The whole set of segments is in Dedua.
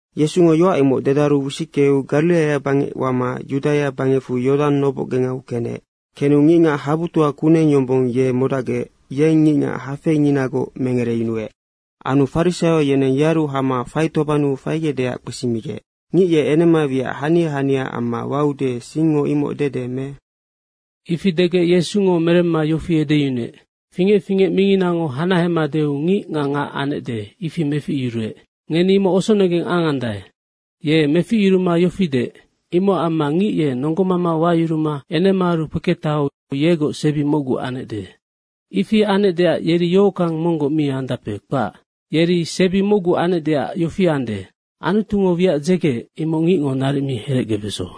Yesungo yoac imoc dedaru wisickeu Gariraia bangec wama Yudaia bangecfu Yodang nobocgengau kenec. Kenu ngicngac habutoa kuneng yombong ye modacgec yeng ngicngac hafeinginagoc mengereyunuec. Anu farisaio yeneng yearu hama faitobannu faigecdeac kpesimigec, “Ngic ye enema wiac hania haniaac amma waude, singngo imoc dede me?” Ifi degec Yesungo meremma yofi edeyunuec, “Fingec fingec minginango hanahema deu ngic nga ngac anecde, ifi meficyuruec. Ngeni imocnoc osonegeng angandae. Ye meficyuruma yofi deec, ‘Imocac amma ngic ye nonggomama wayuruma enemaaru kpeketaheu yegoc sebi mocgu anecde.’ Ifi anecdeac yeri yohockang monggoc mi andape, kpac. Yeri sebi mocgu anecdeac yofi ande, Anutungo wiac dzegeec, imoc ngicngo naric mi herecgebeso.”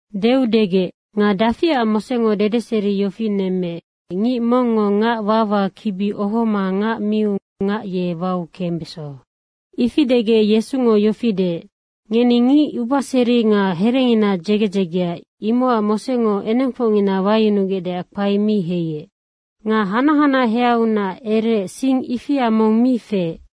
Deu degec, “Nga dafiac Mosengo dedeseri yofi nemmeec, ngic mongngo ngac wawa kibi ohoma ngac miu ngac ye wau kembeso?” Ifi degec Yesungo yofi deec, “Ngeni ngic ubaseri nga herengina dzege dzegea, imocac Mosengo enengfocngina wayunugecdeac kpae mi heiec. Nga hanac hanaheaunac ereec sing ifia mong mi feec.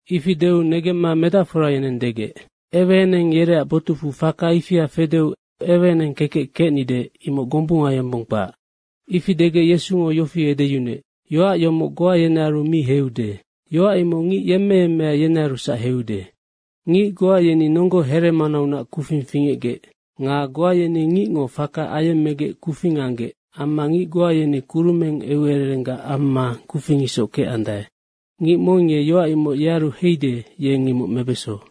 Ifi deu negemma medacfora yeneng degec, “Eweeneng yereac botucfu faka ifia fedeu eweeneng kekec kecnide, imoc gombunga yombong kpac.” Ifi degec Yesungo yofi edeyunuec, “Yoac yomoc goa yenearu mi heiude. Yoac imoc ngic yemmeyemmea yenearusac heiude. Ngic goa yeni nonggo heremanaunac kufing fingecgec. Nga goa yeni ngicngo faka ayemmegec kufing anggec amma ngic goa yeni kurumeng eucererenggac amma kufing isoc kecandae. Ngic mong ye yoac imoc yearu heide, yeng imoc mebeso.”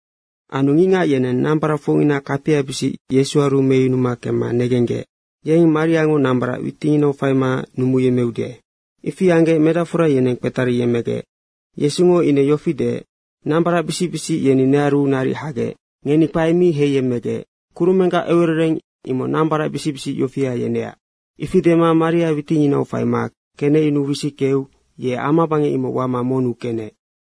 Anu ngicngac yeneng nambaracfocngina kapiabisic Yesuaru meyunu kemma negenggec, “Yeng mariango nambarac witinginau faima numuyemmeude.” ifi anggec medacfora yeneng kpetariyemmegec. Yesungo ine yofi deec, “Nambaracbisic bisic yeni nearu naric hagec. Ngeni kpae mi heiyemmegec. Kurumenggac eucerereng imoc nambaracbisic bisic yofia yeneac.” Ifi dema maria witinginau faima kenecyunuu wisickeu ye amabangec imoc wama monnu kenec.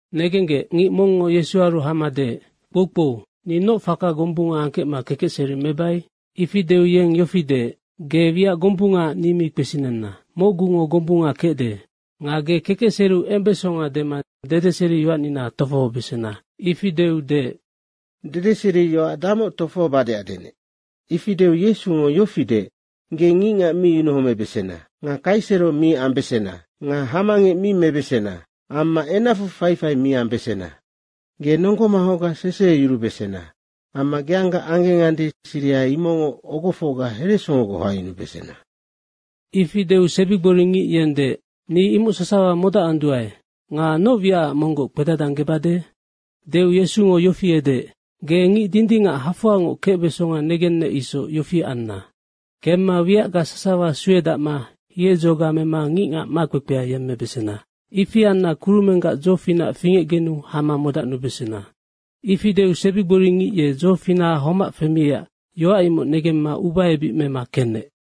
Negenggec, ngic mongngo Yesuaru hama deec, “Kpoukpou, ni noc faka gombunga angkecma kekecseri mebai?” Ifi deu yeng yofi deec, “Ge wiac gombungaac ni mi kpesinenna. Mocgungo gombunga kecde. Nga ge kekecseriu embesonga dema dedeseriyoacnina tofohobesena.” Ifi deu deec, “Dedeseriyoac damoc tofohobadeac denec?” ifi deu Yesungo yofi deec, “Ge ngicngac mi yunuhomebesena nga kaisero mi ambesena nga hamangec mi mebesena amma enacfu faifai mi ambesena. Ge nonggo manghocga seseyurubesena amma geangga anggengande, siriha imocngoc ogofocga heresongogoc hoangyunubesena.” Ifi deu sebigboringic yeng deec, “Ni imoc sasawa modacanduae. Nga noc wiacac monggoc kpedadanggebade?” Deu Yesungo yofi edeec, “Ge ngic dindingac hafoangoc kecbesonga negennec isoc, yofi anna. Kemma wiacga sasawa suedacma hiedzoga mema ngicngac makpekpea yemmebesena. Ifi anna kurumenggac dzofinac fingecgenu hama modacnubesena.” Ifi deu sebigboringic ye dzofinaha homac femiecac yoac imoc negemma ubaebic mema kenec.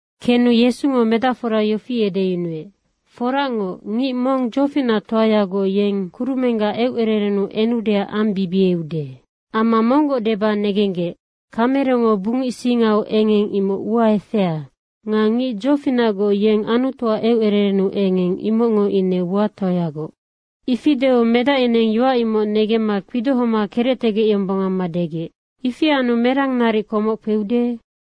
Kenu Yesungo medacfora yofi edeyunuec, “Foracngoc, ngic mong dzofinactoagoc, ye kurumenggac eucererennu enudeac ambibieude. Amma monggoc deba negenggec, kamerengo bungic singau engeng, imoc ua efea nga ngic dzofinacgoc yeng Anutuac eucererennu engeng, imocngo ine uatoayagoc.” Ifi deu medac yeneng yoac imoc negemma kpidohoma kerectegec yombong amma degec, “Ifi anu merang naric komoc kpeude?”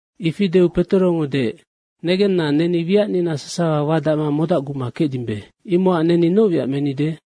Ifi deu Petorongo deec, “Negenna, neni wiacnina sasawa wadacma modacguma kecdimbe. Imocac neni noc wiac menide?”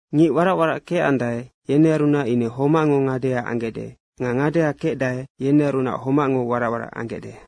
Ngic warac warac kecandae, yenearunac ine homacngo ngadea anggecde nga ngadea kecdae, yenearunac homacngo warac warac anggecde.”